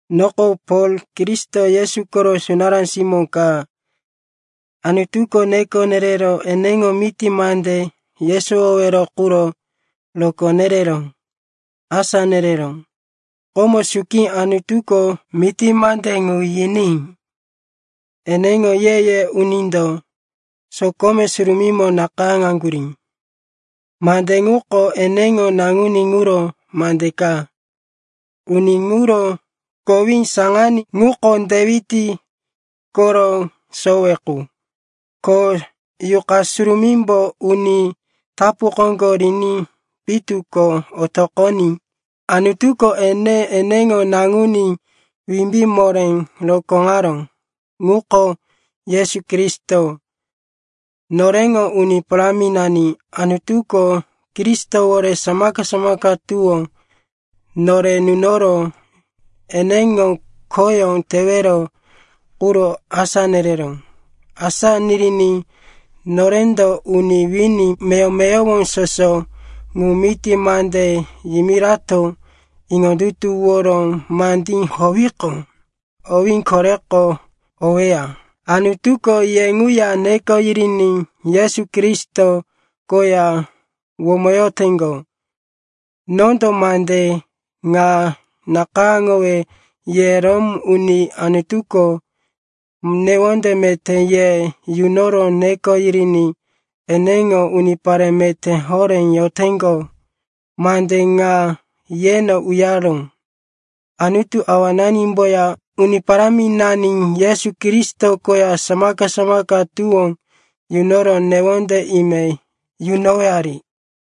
Noko Pol, Kristo Yesu koro sunará simó ka. Anutuko neko nerero eneŋo miti mande yesowowero quro rokó nerero asá nereró. Komo suki, Anutuko miti mande ŋu yiní eneŋo ye-ye unindo sokome surumímo nakayáŋaŋgurí. Mande ŋuko eneŋo Naŋuní ŋuro mande ka. Uni ŋuro kowí saŋaní ŋuko Dewit koro sowe qu, ko Yuqa Surumímbo uni tapu koŋgo riní pitu ko otoqoní Anutuko ene eneŋo Naŋuní wimbí moré rokóŋaró. Ŋuko Yesu Kristo, noreŋo Uni Paráminani. Anutuko Kristowore samaka-samaka tuwó nore nunoro eneŋo khoyó tewero quro asá nereró. Asá niriní norendo uni wini meyowo-meyowo soso ŋu miti mande yimirato iŋondutuworo mandí howiqo, owí koreko oweya. Anutuko ye ŋuya neko yiriní Yesu Kristo koya womoyoteŋgo. Nondo mande ŋa nakayáŋowe ye Rom uni, Anutuko newonde meté ye yunoro neko yiriní eneŋo unipare meté horé yoteŋgo, mande ŋa yeno uyaró. Anutu Awananimboya Uni Paráminani Yesu Kristo koya samaka-samaka tuwó yunoro newonde ime yunowari.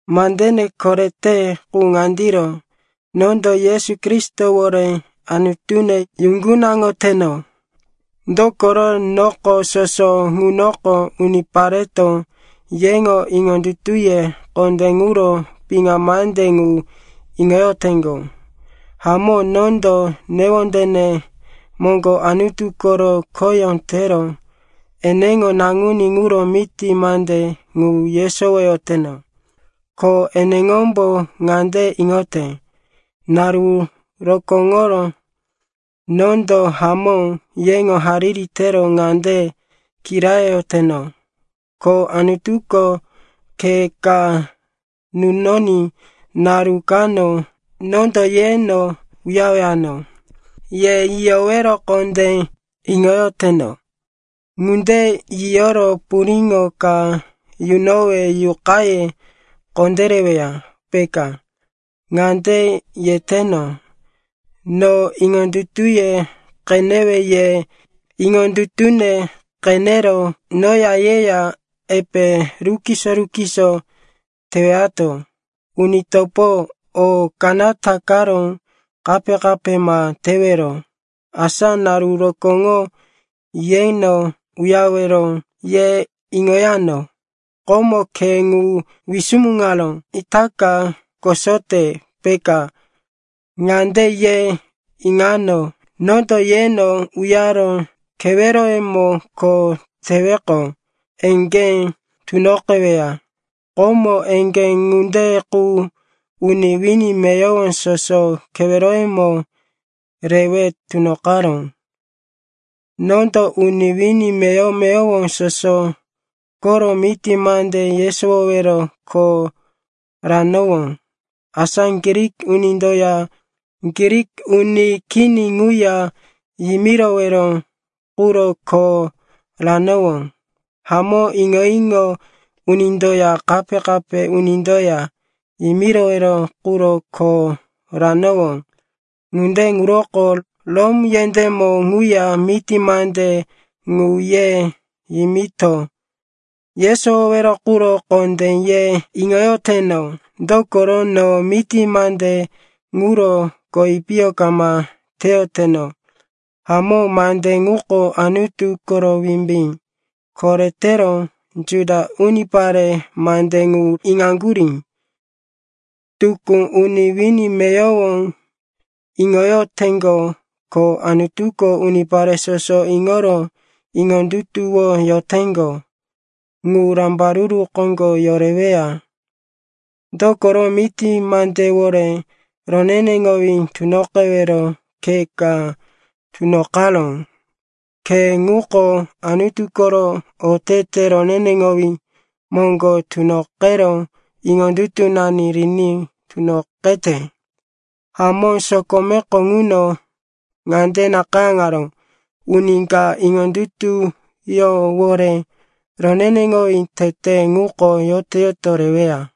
Mandene korete qu ŋandiro. Nondo Yesu Kristowore Anutune yuŋgunaŋoteno, dokoro noko soso ŋunoko unipareto yeŋo iŋondutuye kondé ŋuro piŋa mande ŋu iŋoyoteŋgo. Hamó, nondo newondene moŋgo Anutu koro khoyó tero eneŋo Naŋuní ŋuro miti mande ŋu yesowoyoteno. Ko eneŋombo ŋande iŋote, naru rokóŋoro nondo hamó yeŋo hariri tero ŋande kirayoyoteno, ko Anutuko khe ka nunoní naru kano nondo yeno uyarewano. Ye yiyowero kondé iŋoyoteno. Ŋunde yiyoro puriŋo ka yunowe yuqaye kondéreweya, peka. Ŋande yeteno, no iŋondutuye qenewe ye iŋondutune qenero noya yeya epe rukiso-rukiso tewato. Uni topo, o kanata karo kape-kape ma tewero, asa naru rokóŋo yeno uyarewero, ye iŋoyano. Komo khe ŋu wisumuŋaró, quko itaka kosote, peka. Ŋande ye iŋano, nondo yeno uyaro keweroyemo kho teweqo, eŋgé tunoqeweya. Komo eŋgé ŋunde qu uni wini meyowo soso keweroyemo rewe tunoqaró. Nondo uni wini meyowo-meyowo soso koro miti mande yesowowero kho ranowó, asa Grik unindoya Grik uni kini ŋuya yimirowero quro kho ranowó, hamó iŋo-iŋo unindoya kape-kape unindoya yimirowero quro kho ranowó. Ŋunde ŋuroko Rom yendémo ŋuya miti mande ŋu ye yimito yesowowero quro kondé ye iŋoyoteno. Dokoro no miti mande ŋuro kowi piyo kama teyoteno. Hamó, mande ŋuko Anutu koro wimbí. Koretero Juda unipare mande ŋu iŋaŋgurí, tukú uni wini meyowo iŋoyoteŋgo, ko Anutuko unipare soso iŋoro iŋondutuwoyoteŋgo ŋu rambaruru koŋgo yoreweya. Dokoro miti mandewore roneneŋowí tunoqewero khe ka tunoqaró. Khe ŋuko Anutu koro otete roneneŋowí moŋgo tunoqero iŋondutunani riní tunoqete. Hamó, sokomeko ŋuno ŋande nakayáŋaró, “Uni ka iŋondutuyówore roneneŋowí tete ŋuko yoto-yoto reweya.”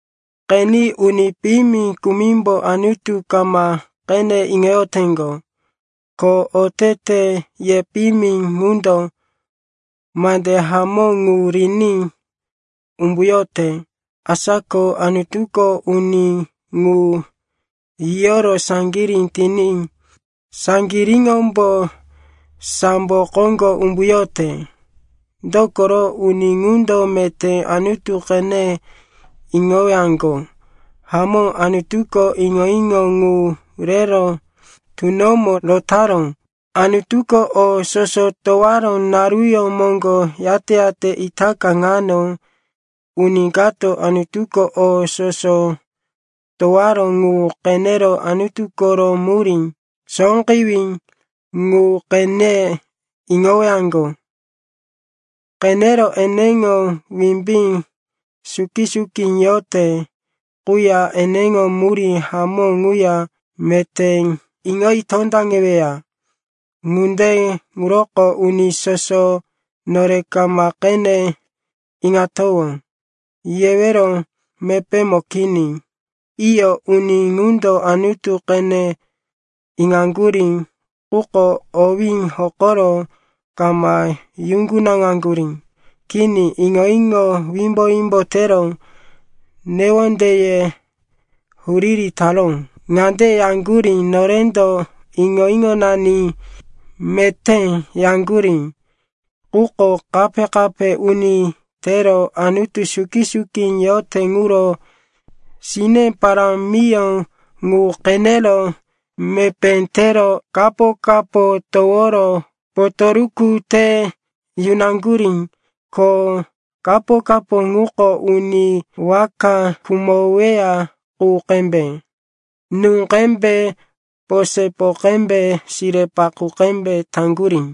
Qeni, uni piyimi kumimbo Anutu kama qene iŋoyoteŋgo ko oteteye piyimi ŋundo mande hamó ŋu riní umbuyote. Asa ko Anutuko uni ŋu yiyoro saŋgirí tiní saŋgiríŋombo sambo koŋgo umbuyote, dokoro uni ŋundo meté Anutu qene iŋowaŋgo. Hamó, Anutuko iŋo-iŋo ŋu rero tunomo rotaró. Anutuko o soso towaró naruyó moŋgo yate-yate itaka ŋano uni kato Anutuko o soso towaró ŋu qenero Anutu koro murí sóqewí ŋu qene iŋowaŋgo. Qenero eneŋo wimbí suki-suki yote quya eneŋo murí hamó ŋuya meté iŋoyi tondaŋeweya. Ŋunde ŋuroko uni soso “Nore kama qene iŋatowó,” yewero mepémo kini. Iyo, uni ŋundo Anutu qene iŋaŋgurí, quko owí hokoro kama yuŋgunaŋaŋgurí. Kini, iŋo-iŋo wimbo-wimbo tero newondeye huriri taró. Ŋande yaŋgurí, norendo iŋo-iŋonani meté, yaŋgurí, quko kape-kape uni tero Anutu suki-suki yote ŋuro sine parámiyó ŋu qenero mepé tero kapo-kapo toworo potoruku te yunaŋgurí. Ko kapo-kapo ŋuko uni waka khumoweya qu qembe, nú qembe, posepo qembe, sire-paqú qembe taŋgurí.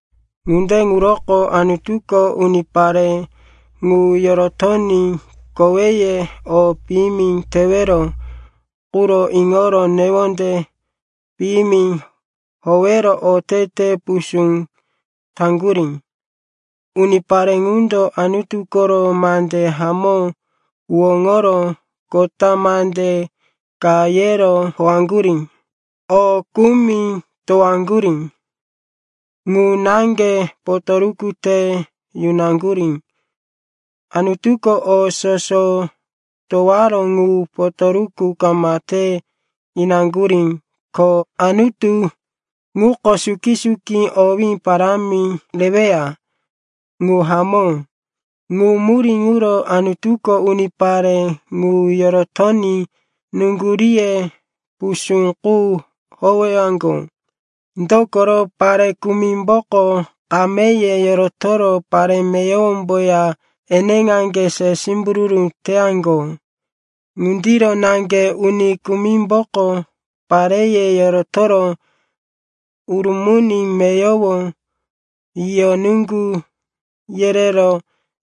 Ŋunde ŋuroko Anutuko unipare ŋu yorotoní koweye o piyimi tewero quro iŋoro newonde piyimi howero otete pusú taŋgurí. Unipare ŋundo Anutu koro mande hamó huwóŋoro kota mande ka yero howaŋgurí. O kumi towaŋgurí ŋu naŋge potoruku te yunaŋgurí, Anutuko o soso towaró ŋu potoruku kama te inaŋgurí. Ko Anutu ŋuko suki-suki owí parámi reweya. Ŋu hamó. Ŋu murí ŋuro Anutuko unipare ŋu yorotoní nuŋguríye pusú qu howeyaŋgo. Dokoro pare kumimboko kameye yorotoro pare meyowomboya eneqaŋge se simbururu teyaŋgo. Ŋundiro naŋge uni kumimboko pareye yorotoro urumuni meyowo yiyo nuŋgu yerero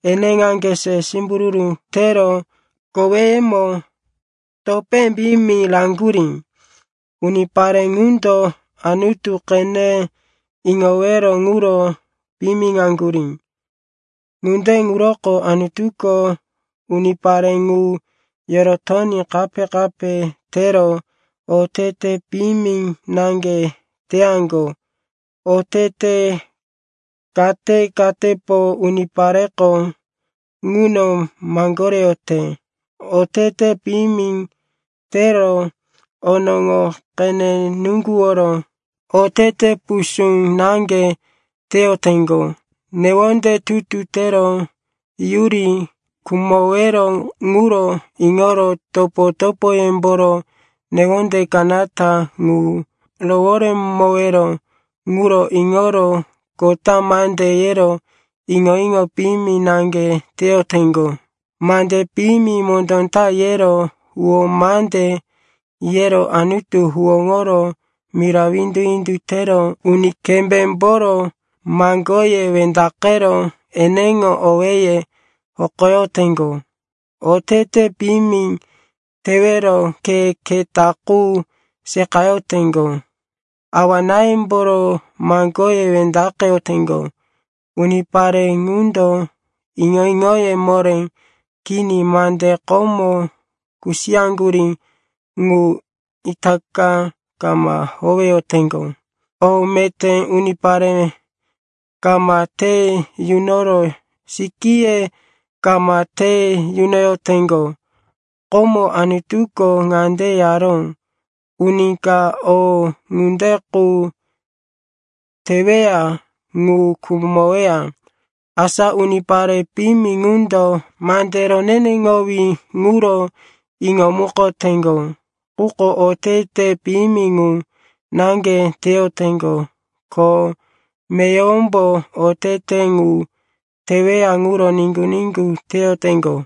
eneqaŋge se simbururu tero koweyemo topé piyimi raŋgurí. Unipare ŋundo Anutu qene iŋowero ŋuro piyimiŋaŋgurí. Ŋunde ŋuroko Anutuko unipare ŋu yorotoní kape-kape tero otete piyimi naŋge teyaŋgo. Otete kate-katepo unipareko ŋuno maŋgoreyote. Otete piyimi tero, onoŋo qene nuŋguworo, otete pusú naŋge teyoteŋgo. Newonde tutu tero, yuri khumowero ŋuro iŋoro, topo-topoyemboro newonde kanata ŋu roworemowero ŋuro iŋoro, kota mande yero, iŋo-iŋo piyimi naŋge teyoteŋgo. Mande piyimi mondó ta yero, huwó mande yero, Anutu huwóŋoro, mira windu-windu tero, uni kembémboro maŋgoye wendaqero, eneŋo owéye hokoyoteŋgo. Otete piyimi tewero khe keta qu seqayoteŋgo. Awa-náyemboro maŋgoye wendaqeyoteŋgo. Unipare ŋundo iŋo-iŋoye moré kini, mande komo kusiyaŋgurí ŋu itaka kama howeyoteŋgo, o meté unipare kama te yunoro, sikíye kama te yunoyoteŋgo. Komo Anutuko ŋande yaró, uni ka o ŋunde qu teweya ŋu khumoweya. Asa unipare piyimi ŋundo mande roneneŋowí ŋuro iŋomukoteŋgo. Quko otete piyimi ŋu naŋge teyoteŋgo, ko meyowombo otete ŋu teweya ŋuro niŋgu-niŋgu teyoteŋgo.